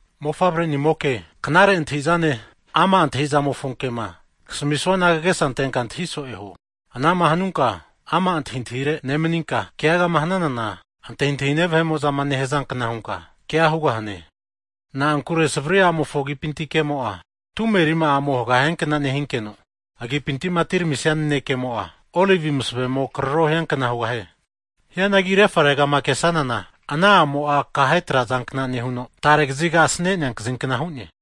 Mofavrenimoke, knare antahi'zane ama' antahi'zamofo kema kasamisuana kagesa antenka antahi so'e huo. Anama hanunka ama' antahintahire nemaninka, keagama hananana antahintahine vahe'mo'za nehazankna hunka kea hugahane. Na'ankure savri a'mofo agipinti kemo'a, tume rima'amo haga hiankna nehinkeno, agipinti'ma atiramisia nanekemo'a, olivi masavemo fru huno karoro hiankna hugahie. Hianagi refaregama kesanana, ana a'mo'a akahe trazankna nehuno, tare kaziga asane'nea kazinkna hu'ne.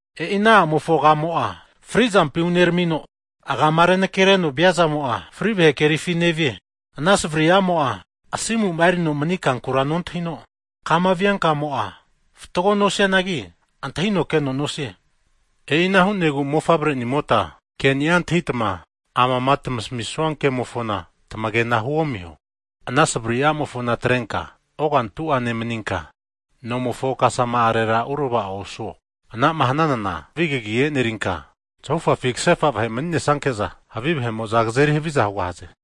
E'i ana a'mofo agamo'a fri'zampi uneramino, agama renakereno viazamo'a, fri vahe kerifi nevie. Ana savari a'mo'a, asimu'ma erino mani kankura nontahino, kama via kamo'a fatgoa nosianagi antahino keno nosie. E'ina hu'negu mofavrenimota ke'ni'a antahitama, amama tamasamisua kemofona tamagena huomiho. Ana savari a'mofona atrenka ogantu'a nemaninka, nomofo kasama'arera uravao osuo. Anama hananana havi kagi e'nerinka, zahufafi kasefa vahe mani'nesanke'za, havi vahe'mo'za kazeri haviza hugahaze.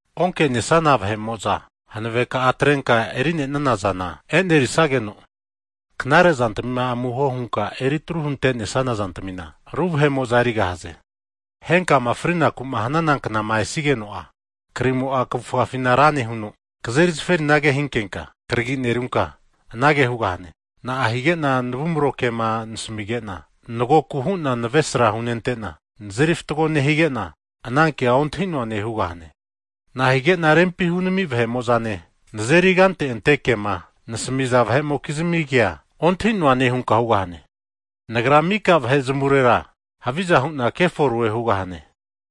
Onke'nesana vahe'mo'za hanaveka'a atrenka eri'nanazana, e'nerisageno, knare zantamima amuho hunka eritru huntesana zantamina ru vahe'mo'za erigahaze. Henkama frinaku'ma hanana knama esigeno'a, krimo'a kavufafina ra nehuno, kazeri zaferinage hinkenka karagi nerunka, anage hugahane, na'a hige'na navumaro kema nenasimige'na, navesra hunente'na, nazeri fatgo nehige'na, anankea ontahi'noane hugahane. Nahige'na rempi hunami vahe'mo'zama nazeri kante ante kema nasamiza vahe'mokizmi kea ontahi'noane hunka hugahane! Nagra mika vahe zamavurera haviza hu'na keforoe hugahane.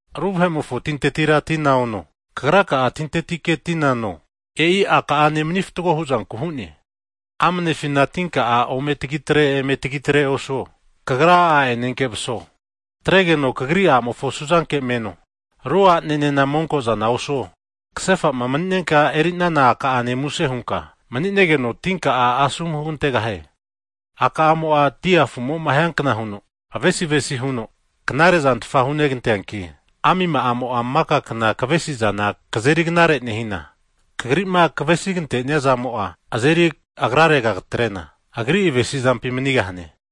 Ru vahe'mofo tintetira tina ono, kagra'a tintetike tina no, e'i a'ka'ane mani fatgo huzanku hu'ne. Amanefina tinka'a ome tagi atre, eme tagitre osuo. Kagra a'enenke'za maso. Atregeno kagri a'mofo suzanke meno, aru a'nenena monkozana osuo. Kasefa'ma mani'nenka e'rinana a'ka'ane muse hunka mani'negeno, Anumzamo'a asomu hugantegahie. A'ka'amo'a dia a' afu'mo'ma hiankna huno avesi avesi huno knare zantfa huneganteanki, amima'amo'a maka kna kavesizana kazeri knare nehina, kagri'ma kavesi kantenia zamo'a kazeri agrarega atre'na agri avesi'zampi manigahane.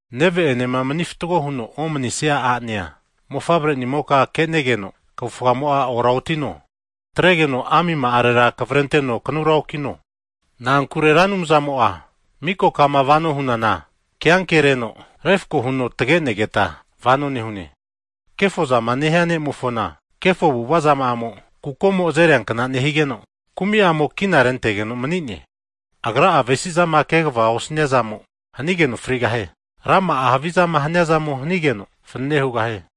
Neve'enema mani fatgo huno'ma omanisia a'nea mofavre'nimoka ke'negeno kavufgamo'a oraotino. Atregeno amima'arera kavrenteno kanura okino. Na'ankure Ra Anumzamo'a miko kama vano hunana, ke'ankereno refako huno tage'negeta vano nehune. Kefozama nehia ne'mofona kefo avu'ava zama'amo'a kukomo azeriankna nehigeno, kumi'amo kina rentegeno nemanie. Agra'a avesizama kegavama osaniazamo hanigeno frigahie. Rama'a havizama haniazamo hanigeno, fanane hugahie.